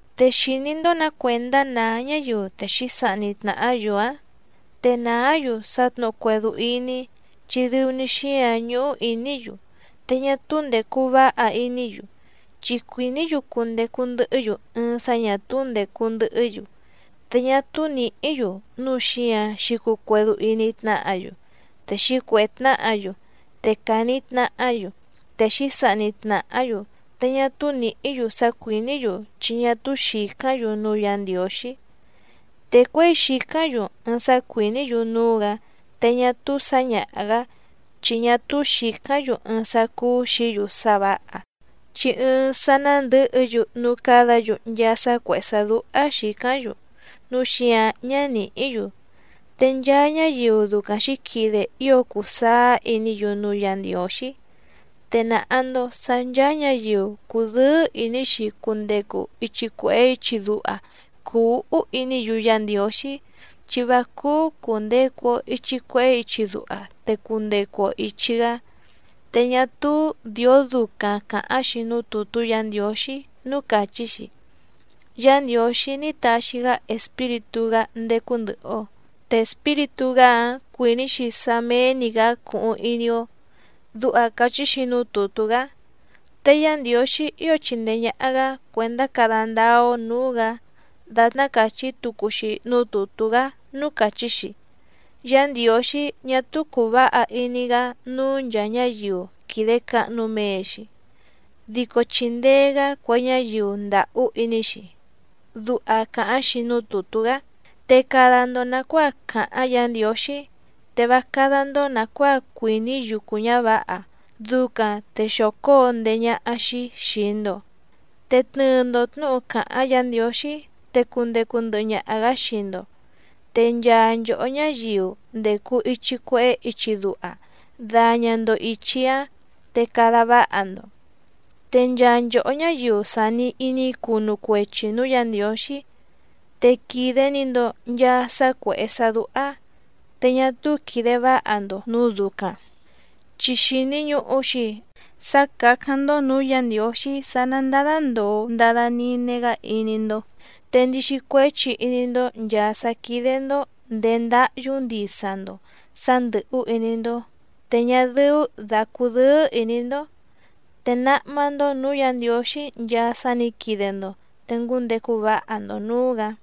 ¿Te xìní‑ndó nǎ cuèndá nàá ñáyiu te xǐsahni tnàhá‑yu‑ǎⁿ? Te nàá‑yu sá tnǔhu cuédú íní, chi dɨu‑ni xíǎⁿ ñúhú ìní‑yu, te ñá túú ndècu váha iní‑yu. Chi cuìní‑yu cundecu ndɨhɨ́‑yu ɨɨⁿ sá ñà túú ndècu ndɨhɨ́‑yu, te ñá túú nìhí‑yu núu xíǎⁿ xǐcuu cuédú íní tnáhǎ‑yu, te xǐcuèhé tnáhǎ‑yu, te càni tnahá‑yu, te xǐsahni tnàhá‑yu. Te ñá túú nìhí‑yu sá cuìní‑yu chi ñá túú xìcáⁿ‑yu núú Yǎ Ndiǒxí. Te cuěi xìcáⁿ‑yu ɨɨⁿ sá cuìní‑yu núú‑gǎ te ñá túú sǎñaha‑gǎ, chi ñá túú xìcáⁿ‑yu ɨɨⁿ sá cúú xìí‑yu sá vǎha, chi ɨɨⁿ sá ná ndɨ̌hɨ‑yu núú cádǎ‑yu nchaa sá cuèhé sá dúhá xìcáⁿ‑yu, núu xíǎⁿ ñá nìhí‑yu. Te nchaa ñáyiu ducaⁿ xǐquide ío cùu sáá iní‑yu núú Yǎ Ndiǒxí. Te nàha‑ndo sá ncháá ñǎyiu cùdɨ́ɨ́ ìní‑xi cundecu ichi cuèhé ichi duha cùu úhú iní‑yu Yá Ndiǒxí, chi vá cúú cùndecu‑o ichi cuehé ichi duha, te cundecu‑o ìchi‑gá. Te ñá túú dìó ducaⁿ càháⁿ‑xi núú tùtú Yǎ Ndiǒxí núú càchí‑xi: “Yá Ndiǒxí ní taxi‑gá Espíritú‑gá ndécú ndɨ̀hɨ‑o. Te Espíritú‑gá‑áⁿ cuìní‑xi sá méé‑ní‑gǎ cuhuⁿ iní‑ó”, duha càchí‑xi núú tùtú‑gá. Te Yá Ndiǒxí ío chìndee ñaha‑gá cuèndá cada ndáá‑ó nǔú‑gǎ dàtná càchí tucu‑xi núú tùtú‑gá núú càchí‑xi: “Yá Ndiǒxí ñá túú cùu váha iní‑gá núú nchàa ñáyiu quìde cahnu mee‑xi, dico chìndee‑gá cue ñáyiu ndàhú iní‑xi”, duha càháⁿ‑xi núú tùtú‑gá. Te cada‑ndo nàcuáa càháⁿ Yǎ Ndiǒxí. Te vá cádá‑ndó nàcuáa cuìní yucu ñǎvǎha, ducaⁿ te xóo cóo ndéé ñáhá‑xí xìi‑ndo. Te tnɨɨ‑ndo tnǔhu càháⁿ Yǎ Ndiǒxí te cundecu ndɨhɨ ñaha‑gǎ xii‑ndo. Te nchaa nchòhó ñáyiu ndècu ichi cuehé ichi duha daña‑ndo ìchi‑áⁿ te cada váha‑ndo. Te nchaa nchòhó ñáyiu sàni iní cunu cuechi nǔú Yǎ Ndiǒxí te quìde‑ni‑ndo nchaa sá cuèhé sá dúhá, te ñá túú quìde váha‑ndo nǔu ducaⁿ, chi xìni ñuhu‑xi sá càcáⁿ‑ndó nǔú Yǎ Ndiǒxí sá ná ndádá ndòo ndada nine‑gá iní‑ndó. Te ndixi cuéchi iní‑ndó nchàa sá quídé‑ndó ndèé ndáhyú ndisa‑ndo sǎ ndɨ̀hú iní‑ndó, te ñá dɨ́ú dà cudɨ́ɨ́ ìní‑ndó. Te náhmá‑ndó nǔú Yǎ Ndiǒxí nchaa sá nǐ quide‑ndo, te ngúndecu váha‑ndo nǔú‑gǎ.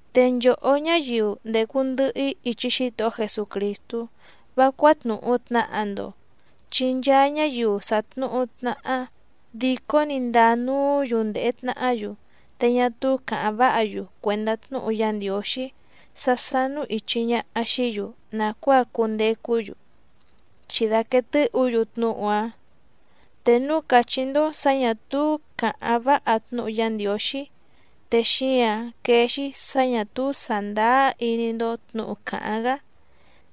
Te nchòhó ñáyiu ndècu ndɨhɨ‑í ichi Xítohó Jesucrìstú, vá cuátnùhu tnaha‑ndo, chi nchaa ñáyiu sàtnuhu tnaha dìcó‑ni ndàa nuú‑yu ndèhe tnahá‑yu, te ñá túú càháⁿ váha‑yu cuèndá tnúhu Yá Ndiǒxí sá sánú ìchi ñaha xií‑yu nàcuáa cundecú‑yu, chi dàquee tɨ́hǔ‑yu tnúhu‑áⁿ. Te núu càchí‑ndó sǎ ñà túú càháⁿ váha tnúhu Yá Ndiǒxí, te xíǎⁿ quéé‑xí sǎ ñà túú sàndáá iní‑ndó tnǔhu càháⁿ‑gá,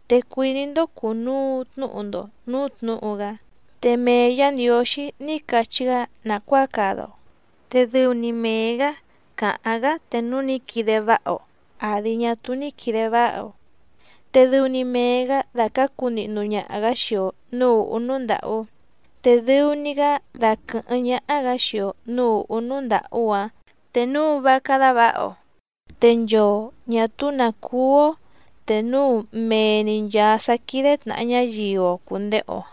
te cuìní‑ndó cùnuu tnúhu‑ndo nǔú tnǔhu‑gá. Te mee Yǎ Ndiǒxí ní cachí‑gá nàcuáa cada‑o, te dɨu‑ni mee‑gǎ càháⁿ‑gá te núu ní quide váha‑o, àdi ñá túú ní quìde váha‑o. Te dɨu‑ni mee‑gǎ dàcácu nihnu ñaha‑gǎ xii‑o nǔú ùhú núú ndàhú, te dɨu‑ni‑gá daquɨ̀hɨ́ⁿ ñáhá‑gǎ xii‑o nǔú ùhú núú ndàhú‑áⁿ te núu vá cádá vǎha‑o. Te nchoo ñà túú nǎ cúú‑ó, te núu mee‑ni nchàa sá quídé tnàha ñáyiu‑o cùndehe‑o.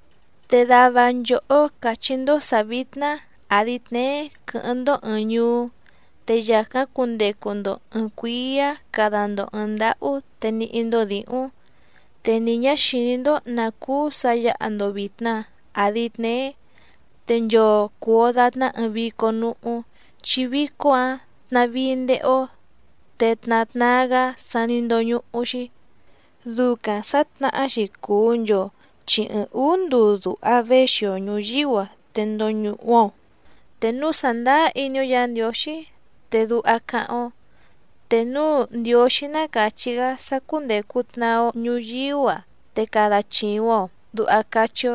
Te dava nchòhó càchí‑ndó sǎ vítná àdi tneé quɨ́hɨ́ⁿ‑ndó ɨ̀ɨⁿ ñuú, te yàcáⁿ cundecu‑ndo ɨ̀ɨⁿ cuíá cada‑ndo ɨ̀ɨⁿ ndáhú te níhí‑ndó dǐhúⁿ. Te ni ñǎ xìní‑ndó nǎ cúú sǎ yǎha‑ndo vìtna àdi tneé. Te nchoo cùu‑o datná ɨɨⁿ vícó núhú, chi vícó‑ǎⁿ tnàvíí ndéhé‑ó te tna tnaa‑gá sa ní ndóñúhú‑xí. Ducaⁿ sǎtnahá‑xi cùu nchoo chi ɨɨⁿ ǔú nduu duha věxi‑o ñùyíú‑a te ndoñuhu‑o. Te núu sàndáá iní‑ó Yǎ Ndiǒxí te duha cáháⁿ‑ó: “Te núu Ndiǒxí ná càchí‑gá sá cúndècu tnaa‑o ñuyíú‑a te cada chìuⁿ‑o”, duha cachí‑ó.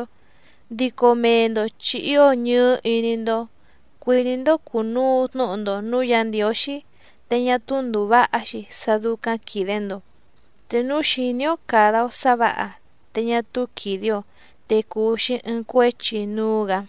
Dico mee‑ndo chi ío ñɨɨ́ iní‑ndó cuìní‑ndó cùnuu tnúhu‑ndo nǔú Yǎ Ndiǒxí, te ñá túú ndùu váha‑xi sá dúcáⁿ quìde‑ndo. Te núu xìní‑ó càda‑o sá vǎha te ñá túú quìde‑o, te cùu‑xi ɨɨⁿ cuéchi núú‑gǎ.